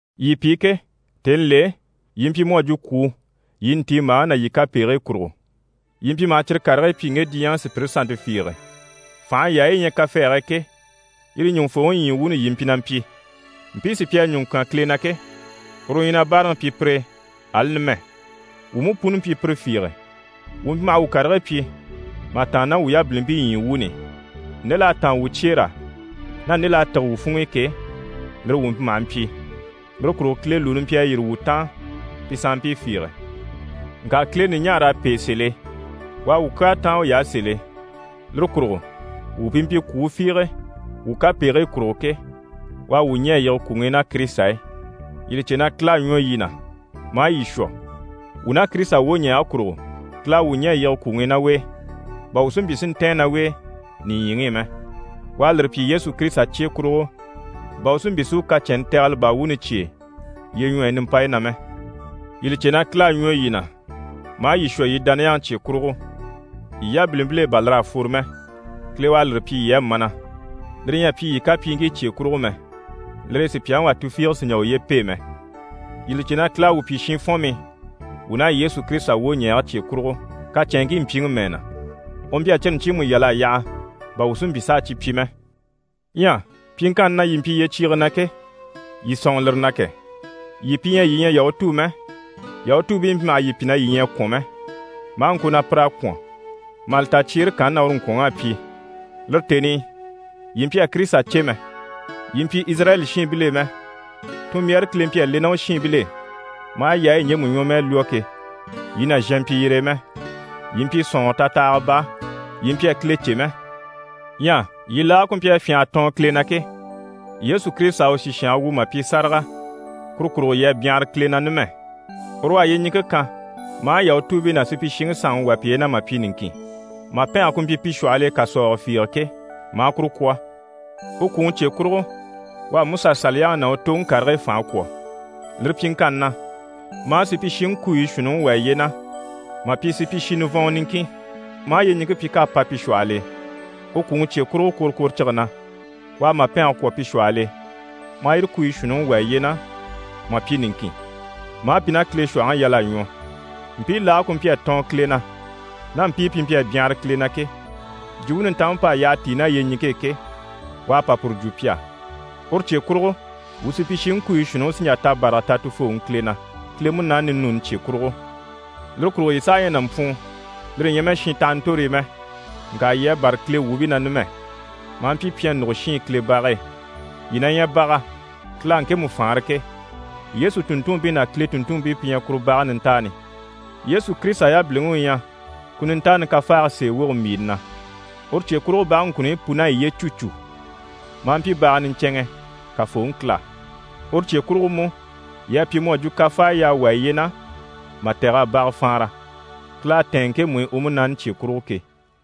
Yii pi ke, tèni l'e, yii mpyi mu à jwo kwùu yii ntiimbaaŋi ná yii kapegigii kurugo. Yii mpyi maha cyire karigii pyi ŋge diɲyɛŋi sùpyire sannte fiige. Fànha yaayi yi ɲyɛ kafɛɛge e ke, yire ɲùŋufooŋi ɲyii wuuni yii mpyi na mpyi. Mpii sí pi à ɲùŋɔ kyán Kile na ke, uru u ɲyɛ na báaraŋi pyi pire e, ali numɛ. Wuu mú puni mpyi pire fiige, wuu mpyi maha wuu karigii pyi mà tàanna ná wuu yabilimpii ɲyii wuuni i, nde l'à táan wuu cyeer'á ná nde l'à tîge wuu funŋ'i ke, lire wuu mpyi maha mpyi. Lire kurugo Kile lùuni mpyi a yîri wuu taan pi sanmpii fiige. Ŋka Kile ɲùɲaar'à pêe sèl'e. U à wuu kyaa táan uy'á sèl'e. Lire kurugo wuu pi mpyi kwùu fiige wuu kapegigii kurugo ke, u à wuu ɲɛ̀ a yige kwùŋi i ná Kirisita e. Yii li cè na Kile à ɲwɔ yii na, maa yii shwɔ. Wuu ná Kirisita wwoɲɛɛge kurugo, Kile à wuu ɲɛ̀ a yige kwùŋi i ná u e, bà wuu si mpyi si ntɛ̀ɛn ná u e nìɲyiŋi i mɛ. U à lire pyi Yesu Kirisita cye kurugo, bà u si mpyi si u kacɛnni tɛgɛlɛ baa wuuni cyêe lyeɲwɔyi nimpayi na mɛ. Yii li cè na Kile à ɲwɔ yii na, maa yii shwɔ yii dániyaŋi cye kurugo. Yii yabilimpil'e bà lir'à fworo mɛ. Kile u à lire pyi yii á mana. Lire ɲyɛ a pyi yii kacɛnŋkii cye kurugo mɛ, lire e sùpyaŋi wà tufiige sì n‑jà uye pêe mɛ. Yii li cè na Kile à wuu pyi shinfɔnmii wuu ná Yesu Kirisita wwoɲɛɛge cye kurugo, kacɛnŋkii mpyiŋi mɛɛ na, u mpyi a cyire ɲcyiimu yal'a yaha, bà wuu si mpyi s'a cyi pyi mɛ. Ɲyɛ pyiŋkanni na yii mpyi yyecyiige na ke, yii sɔ̂nŋɔ lire na kɛ! Yii pi ɲyɛ yii ɲyɛ Yahutuu mɛ, Yahutuubii mpyi maha yii pyi na yii ɲyɛ a kwɔ̀n mɛ, maa ŋko na pir'à kwɔ̀n, mà li ta cyeere kanni na uru ŋkwɔ̀nŋ'à pyi. Lire tèni i, yii mpyi a Kirisita cè mɛ, yii mpyi Izirayɛli shiinbil'e mɛ, tunmbyaare Kile mpyi a le ná u shiinbil'e maa yaayi ɲjemu ɲwɔmɛɛ lwɔ́ ke, yii nàzhan mpyi yire e mɛ. Yii mpyi sɔ̀nŋɔrɔ tatahaga baa, yii mpyi a Kile cè mɛ. Ɲyɛ yii laage ku mpyi a fyânha a tɔɔn Kile na ke, Yesu Kirisita à u sìshange wu mà pyi sáraga, kuru kurugo yii à byanhara Kile na numɛ. Uru u à yyeɲiŋke kan, maa Yahutuubii ná supyishiŋi sanŋi wà piye na mà pyi niŋkin. Màpɛnge ku mpyi pi shwɔhɔl'e kàsɔɔgɔ fiige ke, maa kuru kwɔ̀. U kwùŋi cye kurugo, u à MusaSaliyaŋi ná u toŋi karigii fànhe kwɔ̀. Lire pyiŋkanni na, maa supyishiŋi kuuyi shuunniŋi wà yiye na mà pyi supyishi nivɔnŋɔ niŋkin, maa yyeɲiŋke pyi k'à pa pi shwɔhɔl'e. U kwùŋi cye kurugo kworokworocige na, u à màpɛnge kwɔ̀ pi shwɔhɔl'e, maa yire kuruɲyi shuunniŋi wà yiye na mà pyi niŋkin, maa pi ná Kile shwɔ̀hɔŋi yal'a ɲwɔ. Mpii laage ku mpyi a tɔɔn Kile na, ná mpii pi mpyi a byanhara Kile na ke, Jwumpe Nintanmpe p'à yyaha tíi ná yyeɲiŋke e ke, u à pa puru jwo pi á. Uru cye kurugo, wuu supyishiŋi kuuyi shuunniŋi sí n‑jà tabaraga ta Tufooŋi Kile na, Kile Munaani ninuuni cye kurugo. Lire kurugo yii saha ɲyɛ nàmpwuun, lire ɲyɛ mɛ shintahantorii mɛ, ŋka yii à bâra Kile wuubii na numɛ, maa mpyi pyɛnnugo shiin Kile bage e. Yii na ɲyɛ baga, Kile à ŋkemu faanra ke. Yesu tùnntunmpii ná Kile tùnntunmpii pi ɲyɛ kuru bage nintaani, Yesu Kirisita yabiliŋi u ɲyɛ ku nintaani kafaage sèe woge mbìini na. Uru cye kurugo, bage ŋkunuɲyi pun'à yiye cû cû, maa mpyi baga niɲcɛnŋɛ Kafooŋi Kile á. Uru cye kurugo mú, yii à pyi mu à jwo kafaaya y'à wà yiye na mà tɛ̀g'a baga faanra, Kile à tɛ̀ɛn ŋkemu i u Munaani cye kurugo ke.